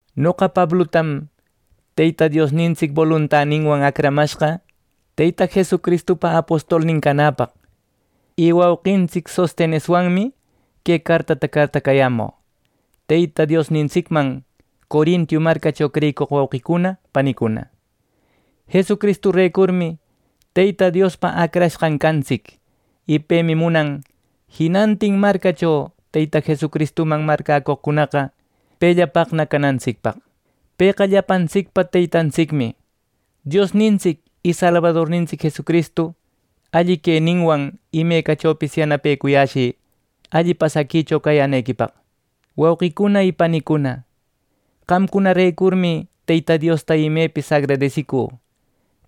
Noqa Pablutam Teyta Diosnintsic boluntaninwan acramashqa Teyta Jesucristupa apostolnin canäpaq, y wauqintsic Sosteneswanmi que cartata cartacayämü, Teyta Diosnintsicman Corinto marcacho creyicoq wauqicuna panicuna. Jesucristurecurmi Teyta Diospa acrashqan cantsic, y pemi munan jinantin marcacho Teyta Jesucristuman marcäcoqcunaqa pellapaqna canantsicpaq. Pëqa llapantsicpa Teytantsicmi. Diosnintsic y Salbadornintsic Jesucristu alli queninwan imecachopis yanapecushï alli pasaquicho cayänequipaq. Wauqicuna y panicuna, qamcunarecurmi Teyta Diosta imepis agradesicü.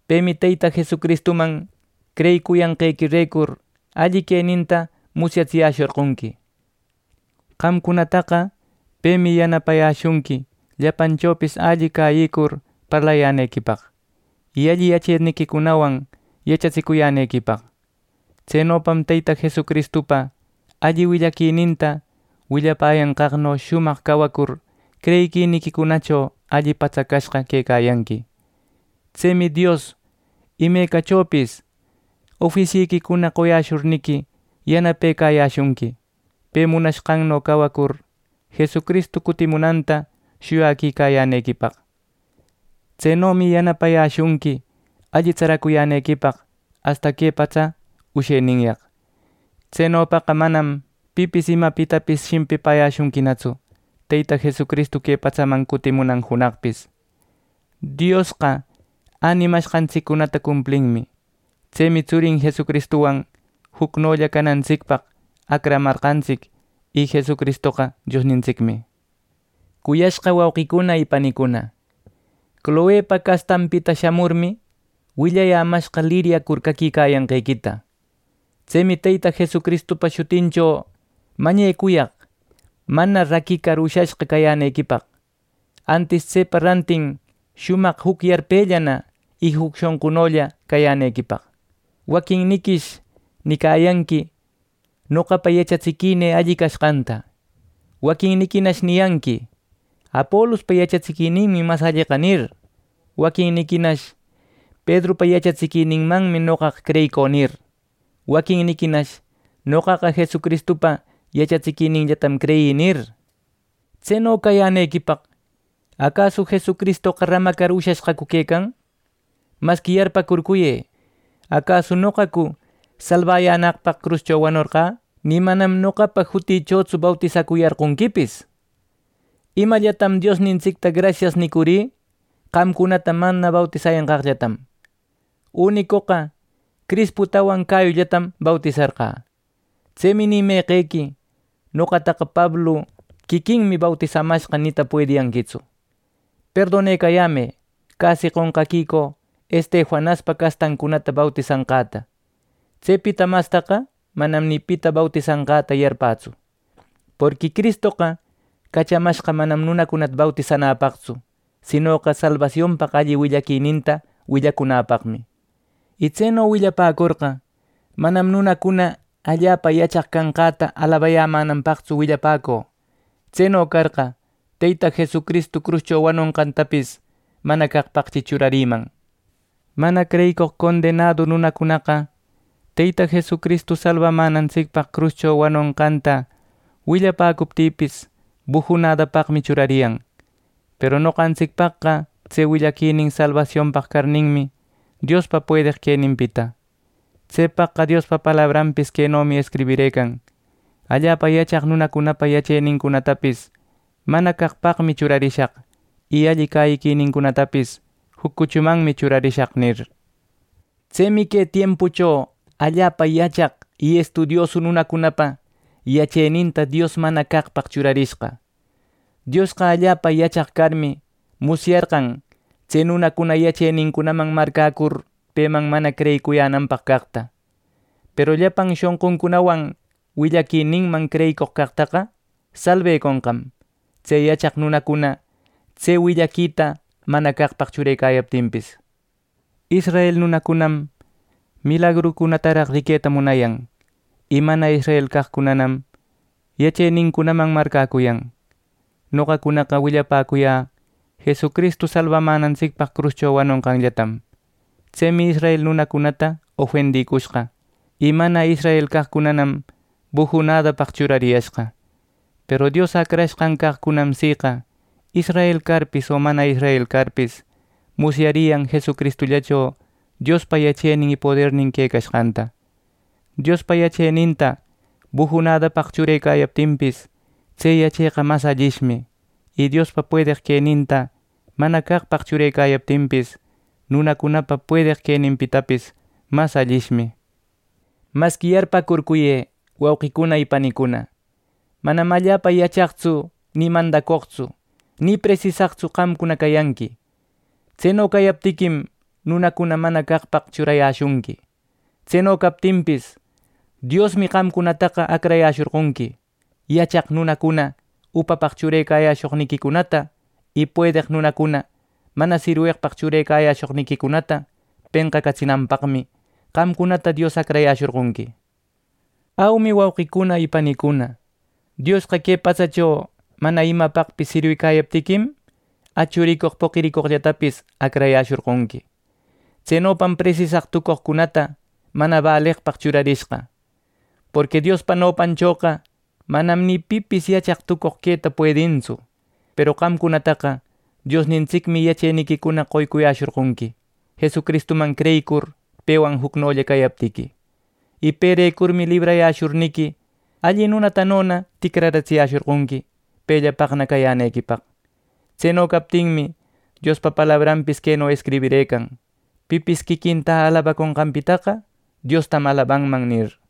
Pemi Teyta Jesucristuman creyicuyanqequirecur alli queninta musyatsiyäshorqonqui. Qamcunataqa pemi yanapayäshunqui llapanchopis alli cäyicur parlayänequipaq, y alli yacheniquicunawan yachatsicuyänequipaq. Tsenopam Teyta Jesucristupa alli willaquininta willapäyanqaqno shumaq cawacur creyiquiniquicunacho alli patsacashqa quecayanqui. Tsemi Dios imecachopis ofisyiquicuna qoyäshurniqui, yanapecayäshunqui, pe munashqanno cawacur Jesucristu cutimunanta shuyaquicayänequipaq. Tsenomi yanapayäshunqui alli tsaracuyänequipaq asta que patsapa usheninyaq. Tsenopaqa manam pipis imapitapis shimpipäyäshunquinatsu Teyta Jesucristu que patsaman cutimunan junaqpis. Diosqa änimashqantsiccunata cumplinmi. Tsemi tsurin Jesucristuwan jucnolla cawanantsicpaq acramashqantsic, y Jesucristoqa Diosnintsicmi. Cuyashqa wauqicuna y panicuna, Cloepa castanpita shamurmi, willayämashqa liryacur caquicayanqequita. Tsemi Teyta Jesucristupa jutincho mañecuyaq mana raquicar ushashqa cayänequipaq; antis tsepa rantin shumaq juc yarpellana y juc shonqunolla cayänequipaq. Waquinniquish nicayanqui: “Noqapa yachatsiquinï alli cashqanta.” Waquinniquinash niyanqui: “Apolupa yachatsiquininmi mas alleqa” nir. Waquinniquinash “Pedrupa yachatsiquininmanmi noqaqa creyicü” nir. Waquinniquinash “Noqaqa Jesucristupa yachatsiquininllatam creyï” nir. ¿Tseno cayänequipaq acasu Jesucristoqa ramacar ushashqacu quecan! Masqui yarpäcurcuyë: ¿Acasu noqacu salbayänaqpaq cruscho wanorqä! ¡Nï manam noqapa jutïchotsu bautisacuyarqonquipis! Imallatam Diosnintsicta “grasias” nicurï, qamcunata mana bautisayanqaqtam. Unicoqa Crisputawan Gayullatam bautisarqä. Tsemi ni meqequi “Noqataqa Pablu quiquinmi bautisamashqa” nita puediyanquitsu. Perdonecayämë casi qonqaquicü Estefanaspa castancunata bautisanqäta. Tsepita mastaqa manam ni pita bautisanqäta yarpätsu. Porqui Cristoqa cachamashqa manam nunacunata bautisanäpaqtsu; sinoqa salbasionpaq alli willaquininta willacunäpaqmi. Y tseno willapäcorqa, manam nunacuna allapa yachaq cashqäta alabayämänanpaqtsu willapäcü. Tseno carqa, Teyta Jesucristu cruscho wanonqantapis mana caqpaqchi churarïman. Mana creyicoq condenadu nunacunaqa Teyta Jesucristu salbamänantsicpaq cruscho wanonqanta willapäcuptïpis, bujunädapaqmi churariyan; peru noqantsicpaqqa tse willaquinin salbasionpaq carninmi, Diospa puedeq queninpita. Tsepaqqa Diospa palabranpis quenomi escribirëcan: “Allapa yachaq nunacunapa yachenincunatapis mana caqpaqmi churarishaq, y alli cäyiquinincunatapis juc cuchumanmi churarishaq” nir. Tsemi que tiempucho allapa yachaq y estudiosu nunacunapa yacheninta Dios mana caqpaq churarishqa. Diosqa allapa yachaq carmi, musyarqan tse nunacuna yachenincunaman marcäcur peman mana creyiyänanpaq caqta, peru llapan shonquncunawan willaquininman creyicoq caqtaqa salbeconqam tse yachaq nunacuna tse willaquita mana caqpaq churecayaptinpis. Israel nunacunam milagrucunataraq riqueta munayan; y mana israel caqcunanam yachenincunaman marcäcuyan. Noqacunaqa willapäcuyä Jesucristu salbamänantsicpaq cruscho wanonqanllatam. Tsemi israel nunacunata ofendïcushqa, y mana israel caqcunanam bujunadapaq churariyashqa. Peru Dios acrashqan caqcunam siqa, israel carpis o mana israel carpis musyariyan Jesucristullacho Diospa yachenin y podernin quecashqanta. Diospa yacheninta bujunädapaq churecayaptinpis, tse yacheqa mas allishmi. Y Diospa puedeq queninta mana caqpaq churecayaptinpis, nunacunapa puedeq queninpitapis mas allishmi. Masqui yarpäcurcuyë, wauqicuna y panicuna, manam allapa yachaqtsu, ni mandacoqtsu, ni presisaqtsu qamcuna cayanqui. Tseno cayaptiquim, nunacuna mana caqpaq churayäshunqui. Tseno captinpis, Diosmi qamcunataqa acrayäshorqonqui. Yachaq nunacuna upapaq churecayäshoqniquicunata, y puedeq nunacuna mana sirweqpaq churecayäshoqniquicunata penqacatsinanpaqmi, qamcunata Dios acrayäshorqonqui. Aumi, wauqicuna y panicuna, Diosqa que patsacho mana imapaqpis sirwicäyaptiquim, achu ricoq, poqi ricoqllatapis acrayäshorqonqui. Tsenopam presisaq tucoqcunata mana bäleqpaq churarishqa. Porqui Diospa nopanchoqa manam ni pipis yachaq tucoq queta puedintsu. Peru qamcunataqa Diosnintsicmi yacheniquicuna qoycuyäshorqonqui, Jesucristuman creyicur pewan jucnolla cayaptiqui. Y perecurmi librayäshurniqui, alli nunatanona ticraratsiyäshorqonqui pellapaqna cayänequipaq. Tseno captinmi, Diospa palabranpis queno escribirëcan: “Pipis quiquinta alabaconqanpitaqa Diostam alabanman” nir.